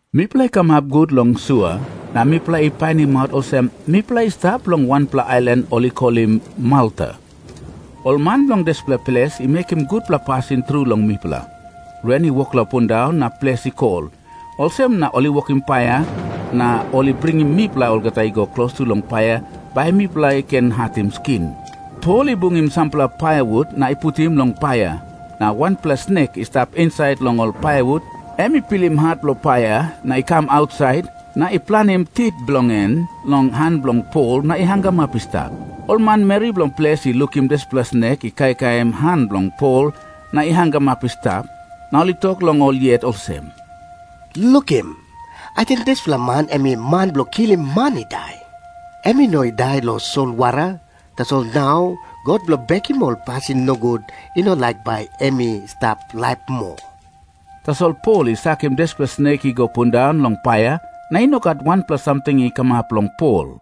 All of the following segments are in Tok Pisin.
Mipela i kamap gut long sua, na mipela i painimaut olsem mipela i stap long wanpela ailan ol i kolim Malta. Ol man bilong dispela ples i mekim gutpela pasin tru long mipela. Ren i wok long pundaun na ples i kol, olsem na ol i wokim paia na ol i bringim mipela olgeta i go klostu long paia bai mipela i ken hatim skin. Pol i bungim sampela paiawut na i putim long paia. Na wanpela snek i stap insait long ol paiawut, em i pilim hat bilong paia, na i kam ausait, na i planim tit bilong en long han bilong Pol na i hangamap i stap. Ol manmeri bilong ples i lukim dispela snek i kaikaim han bilong Pol na i hangamap i stap. Na ol i tok long ol yet olsem, “Lukim. Ating dispela man em i man bilong kilim man i dai. Em i no i dai long solwara, tasol nau god bilong bekim ol pasin nogut i no laik bai em i stap laip moa.” Tasol Pol i sakim dispela snek i go pundaun long paia, na i no gat wanpela samting i kamap long Pol.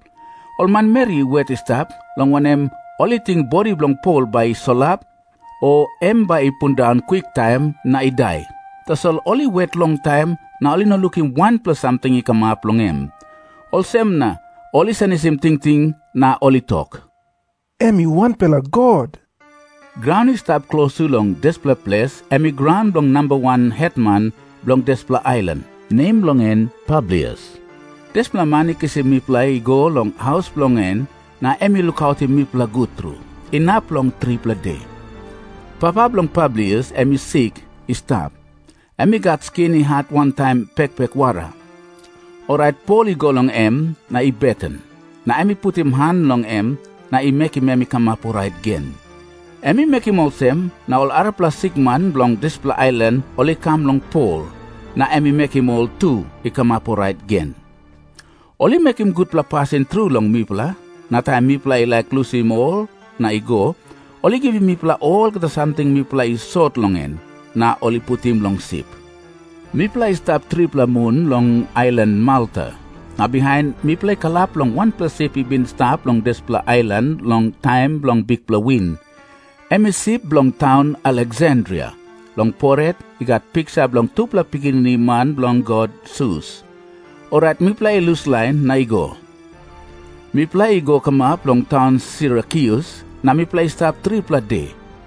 Ol manmeri i wet i stap, long wanem, ol i ting bodi bilong Pol bai i solap, o em bai i pundaun kwiktaim na i dai. Tasol ol i wet longtaim, na ol i no lukim wanpela samting i kamap long em. Olsem na ol i senisim tingting na ol i tok, “Em i wanpela god.” Graun i stap klostu long dispela ples, em i graun bilong namba wan hetman bilong dispela ailan, nem bilong en Publius. Dispela man i kisim mipela i go long haus bilong en, na em i lukautim mipela gut tru, inap long tripela de. Papa bilong Publius em i sik i stap. Em i gat skin i hat wantaim pekpek wara. Orait Pol i go long em na i beten. Na em i putim han long em, na i mekim em i kamap orait gen. Em i mekim olsem, na ol arapela sikman bilong dispela ailan ol i kam long Pol, na em i mekim ol tu i kamap orait gen. Ol i mekim gutpela pasin tru long mipela. Na taim mipela i laik lusim ol na i go, ol i givim mipela olgeta samting mipela i sot long en, na ol i putim long sip. Mipela i stap tripela mun long ailan Malta. Na bihain mipela i kalap long wanpela sip i bin i stap long dispela ailan long taim bilong bikpela win. Em i sip bilong taun Aleksandria. Long poret i gat piksa bilong tupela pikinini man bilong god Sus. Orait mipela i luslain na i go. Mipela i go kamap long taun Sirakyus, na mipela i stap tripela de.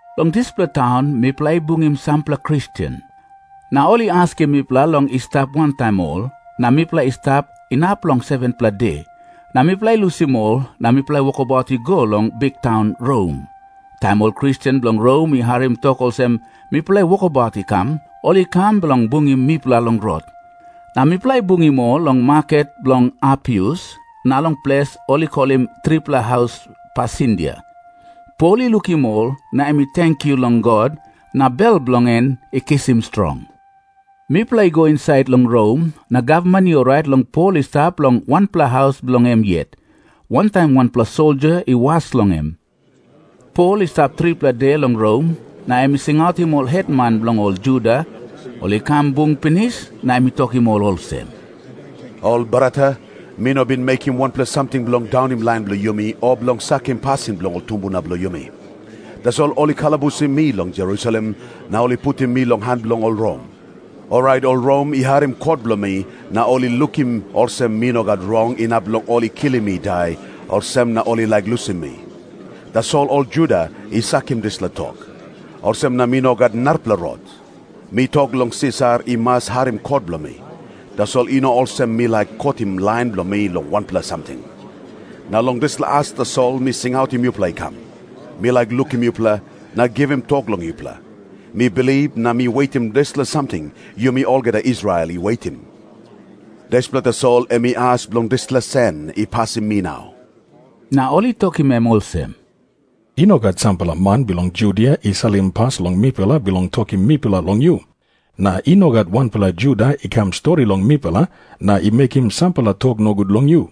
Long dispela taun mipela i bungim sampela Kristen. Na ol i askim mipela long i stap wantaim ol, na mipela i stap inap long 7-pela de. Na mipela i lusim ol, na mipela i wokabaut i go long biktaun Rom. Taim ol Kristen bilong Rom i harim tok olsem mipela i wokabaut i kam, ol i kam bilong bungim mipela long rot. Na mipela i bungim ol long Maket Bilong Apius na long ples ol i kolim Tripela Haus Pasindia. Pol i lukim ol, na em i tenkyu long God, na bel bilong en i kisim strong. Mipela i go insait long Rom, na gavman i orait long Pol i stap long wanpela haus bilong em yet, wantaim wanpela soldia i was long em. Pol i stap tripela de long Rom, na em i singautim ol hetman bilong ol Juda. Ol i kam bung pinis, na em i tokim ol olsem, “Ol brata, mi no bin mekim wanpela samting bilong daunim lain bilong yumi o bilong sakim pasin bilong ol tumbuna bilong yumi. Tasol ol i kalabusim mi long Jerusalem, na ol i putim mi long han bilong ol Rom. Orait ol Rom i harim kot bilong mi, na ol i lukim olsem mi no gat rong inap long ol i kilim mi i dai, olsem na ol i laik lusim mi. Tasol ol Juda i sakim dispela tok. Olsem na mi no gat narapela rot. Mi tok long Sisar i mas harim kot bilong mi. Tasol i no olsem mi laik kotim lain bilong mi long wanpela samting. Na long dispela as tasol mi singautim yupela i kam. Mi laik lukim yupela, na givim tok long yupela. Mi bilip na mi wetim dispela samting yumi olgeta Israel i wetim. Dispela tasol em i as bilong dispela sen i pasim mi nau.” Na ol i tokim em olsem, “I no gat sampela man bilong Judia i salim pas long mipela bilong tokim mipela long yu. Na i no gat wanpela Juda i kam stori long mipela na i mekim sampela tok nogut long yu.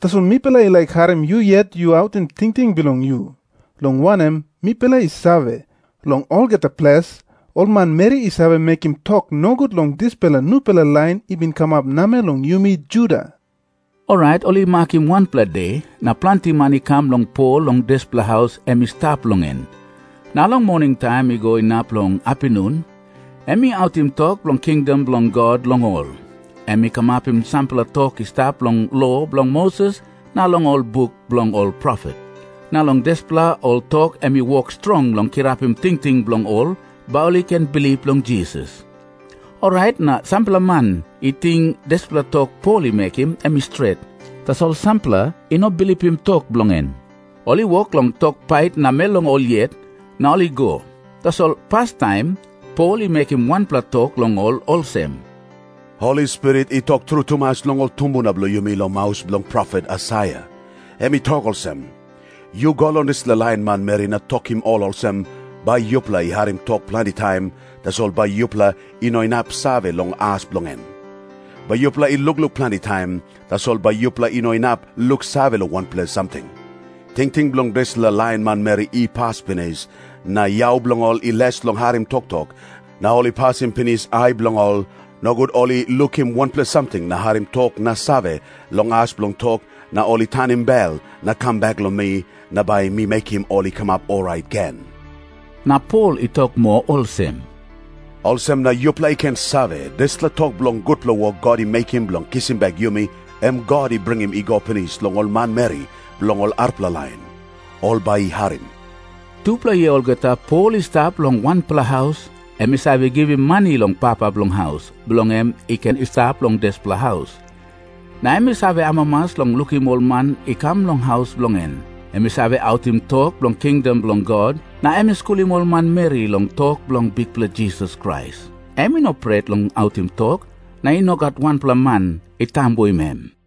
Tasol mipela i laik harim yu yet yu autim tingting bilong yu, long wanem, mipela i save, long olgeta ples, ol manmeri i save mekim tok nogut long dispela nupela lain i bin kamap namel long yumi Juda.” Orait ol i makim wanpela de, na planti man i kam long Pol long dispela haus em i stap long en. Na long moningtaim i go inap long apinun, em i autim tok bilong kingdom bilong God long ol. Em i kamapim sampela tok i stap long lo bilong Moses na long ol buk bilong ol profet, na long dispela ol tok em i wok strong long kirapim tingting bilong ol bai ol i ken bilip long Jisas. Orait na sampela man i ting dispela tok Pol i mekim, em i stret. Tasol sampela i no bilipim tok bilong en. Ol i wok long tok pait namel long ol yet, na ol i go. Tasol pastaim Pol i mekim wanpela tok long ol olsem, “Holi Spirit i tok tru tumas long ol tumbuna bilong yumi long maus bilong profet Aisaia. Em i tok olsem, ‘Yu go long dispela lain manmeri na yu tokim ol olsem, “Bai yupela i harim tok planti taim, tasol bai yupela i no inap save long as bilong en. Bai yupela i lukluk planti taim, tasol bai yupela i no inap luksave long wanpela samting.” Tingting bilong dispela lain manmeri i pas pinis, na yau bilong ol i les long harim toktok, na ol i pasim pinis ai bilong ol, nogut ol i lukim wanpela samting na harim tok na save long as bilong tok, na ol i tanim bel na kam bek long mi, na bai mi mekim ol i kamap orait gen.’” Na Pol i tok moa olsem, “Olsem na yupela i ken save, dispela tok bilong gutpela wok God i mekim bilong kisim bek yumi, em God i bringim i go pinis long ol manmeri bilong ol arapela lain. Ol bai i harim.” Tupela yia olgeta Pol i stap long wanpela haus. Em i save givim mani long papa bilong haus, bilong em i ken i stap long dispela haus. Na em i save amamas long lukim ol man i kam long haus bilong en. Em i save autim tok bilong kingdom bilong God, na em i skulim ol manmeri long tok bilong Bikpela Jisas Krais. Em i no pret long autim tok na i no gat wanpela man i tambuim em.